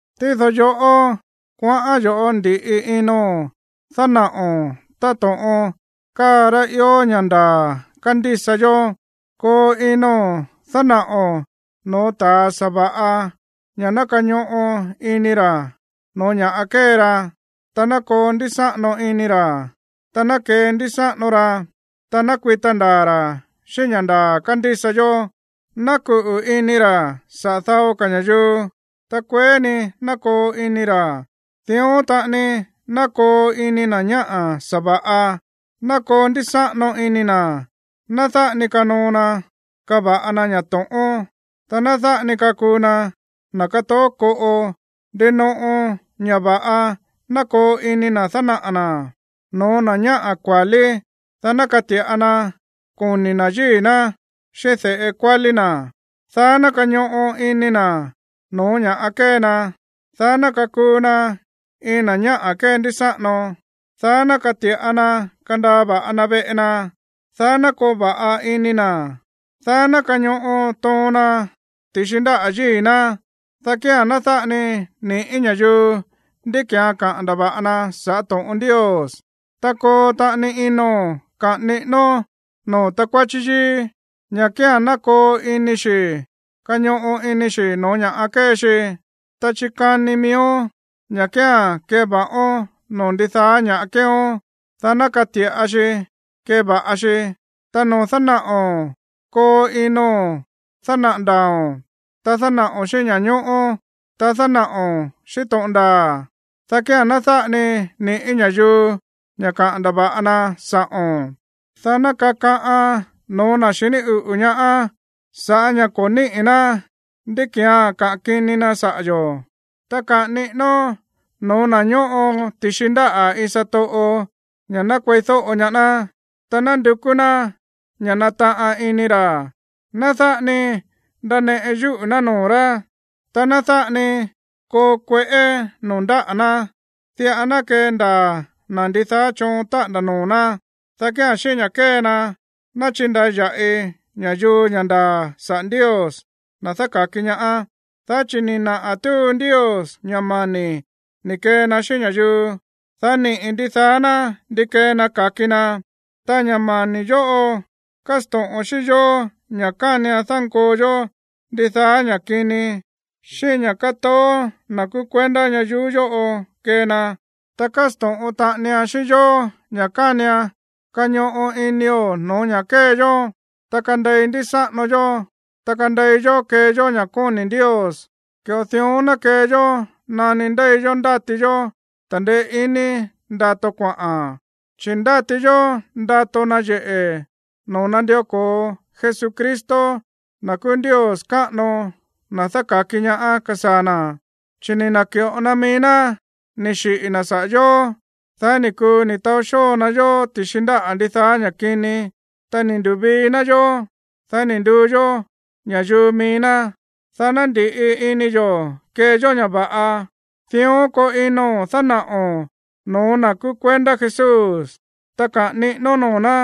Tído yoꞌó, kuaꞌán yo̱ꞌó ndi̱ꞌi ino̱n dánaꞌo̱n táto̱ꞌon káa rá ió ña̱ ndaa̱ kándísa yó. Koo ino̱n dánaꞌo̱n no̱ó ta̱ sa̱va̱ꞌa ña̱ ná kañoꞌo ini ra̱ no̱ó ña̱ꞌa kée ra, ta ná koo ndísáꞌano ini ra̱, ta ná kendísáꞌano ra, ná kuita ndaa̱ ra̱ xíꞌín ña̱ ndaa̱ kándísa yó, ná kuꞌu̱ ini ra̱ saꞌa̱ dao ka̱ ña̱yuu, ta kueé ni ná koo ini ra̱. Dión taꞌani ná koo ini na̱ ñáꞌa̱ sa̱va̱ꞌa, ná koo ndísáꞌano ini na̱. Ná dáꞌa ni kanoo na kava̱ꞌa na ña̱ to̱ꞌón, ta ná dáꞌa ni kakuu na na̱ kátoó koꞌo. Ndinoꞌo ña̱ va̱ꞌa ná koo ini na̱ dánaꞌa̱ na̱ no̱ó na̱ ñáꞌa̱ kua̱lí, dá ná kati̱ꞌa na koni̱ na̱ yíi̱ ná xíꞌín de̱ꞌe kuálí na̱, dá ná kañoꞌo ini na̱ no̱ó ña̱ kée na, dá ná kakuu na iin na̱ ñáꞌa̱ kéndísáꞌano, dá ná kati̱ꞌa na kandaa va̱ꞌa na veꞌe na, dá ná koo va̱ꞌa ini na̱, dá ná kañoꞌo toon na ti̱xi ndáꞌa̱ yíi̱ ná, dá kía̱n ná dáꞌa ni ni̱ꞌí ña̱yuu ndí ki̱án kaꞌa̱n ndava̱ꞌa na saꞌa̱ to̱ꞌon Ndios. Ta koo taꞌani ino̱n kaꞌa̱n niꞌínón noo̱ takuáchí yíí ña̱ kía̱n ná koo ini xi̱ kañoꞌo ini xi̱ no̱ó ña̱ kée xi. Ta chikani miíón ña̱ kía̱n keva̱ꞌón noo̱ ndidaá ña̱ꞌa kéeón, dá ná kati̱ꞌa xi keva̱ꞌa xi. Ta noo̱ dánaꞌo̱n, koo ino̱n dánaꞌa̱ ndaa̱o̱n, ta dánaꞌo̱n xíꞌín ña̱ñóꞌó, ta dánaꞌo̱n xíꞌín to̱ꞌon ndaa̱, dá kía̱n ná dáꞌa ni ni̱ꞌí ña̱yuu ña̱ kaꞌa̱n ndava̱ꞌa na sa̱ꞌo̱n, dá ná kakaꞌan no̱ó na̱ xiní uꞌu̱ ñaá sa̱ꞌá ña̱ ko̱ níꞌi̱ ná ndí ki̱án kaꞌa̱n kini na saꞌa̱ yo̱. Ta kaꞌa̱n niꞌínón no̱ó na̱ ñóꞌo ti̱xi ndáꞌa̱ iin satoꞌo ña̱ ná kueídóꞌo ñaá ná, ta ná ndukú ná ña̱ nataꞌan ini ra̱. Ná dáꞌa ni ndaneꞌe yúꞌu̱ ná noo̱ rá, ta ná dáꞌa ni koo kueꞌé noo̱ ndáꞌa̱ ná. Diꞌa ná kendaa̱ na̱ ndidaá choon táꞌa̱nda̱ noo̱ ná, dá kía̱n xíꞌín ña̱ kée na, ná chindaya̱ꞌi ña̱yuu ña̱ ndaa̱ saꞌa̱ Ndios, na̱ dáka̱ki ñaá. Dá chi̱ ni̱ naꞌa̱ túu Ndios ña̱ mani̱ ni̱ kee na xíꞌín ña̱yuu, dá niꞌi̱ ndidaá ná ndi kee na ka̱ki na. Ta ña̱ mani̱ yóꞌo kásto̱ꞌon xíꞌín yó ña̱ kánian dánkoo yó ndidaá ña̱ kini xíꞌín ña̱ kátoó na̱ kúú kuendá ñayuú yóꞌo kee na. Ta kásto̱ꞌon taꞌanian xíꞌín yó ña̱ kánian kañoꞌo inio̱ no̱ó ña̱ kée yó, ta kandei ndísáꞌano yó, ta kandei yó kee yó ña̱ kóni̱ Ndios. Ki̱ꞌo dión ná kee yó nani ndéi yó ndáti yó ta̱ndeé ini ndato kuaꞌa̱n, chi̱ ndáti yó ndato náyeꞌe̱ noo̱ nandió ko̱o Jesucristo, na̱ kúú Ndios káꞌano, na̱ dáka̱ki ñaá, kasaa̱ na̱. Chi̱ ni̱ na̱ki̱ꞌo na mií ná ni̱ xiꞌi̱ na̱ saꞌa̱ yó, dá ni̱ kuu ni̱ taó xóo na yó ti̱xi ndáꞌa̱ ndidaá ña̱ kini. Ta ni̱ ndu̱vii ná yó, dá ni̱ nduu yó ña̱yuu mií ná, dá ná ndi̱ꞌi ini yo̱ kee yó ña̱ va̱ꞌa. Dión koo ino̱n dánaꞌo̱n no̱ó na̱ kúú kuendá Jesús, ta kaꞌa̱n niꞌínón noo̱ ná.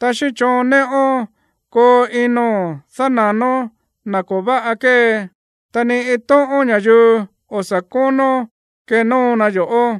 Ta xíꞌín choon néꞌón koo ino̱n dána̱nón na̱ ko̱ váꞌa kée, ta ni iin tóꞌón ña̱yuu o̱ sa̱ kónó kenóo na yo̱ꞌó.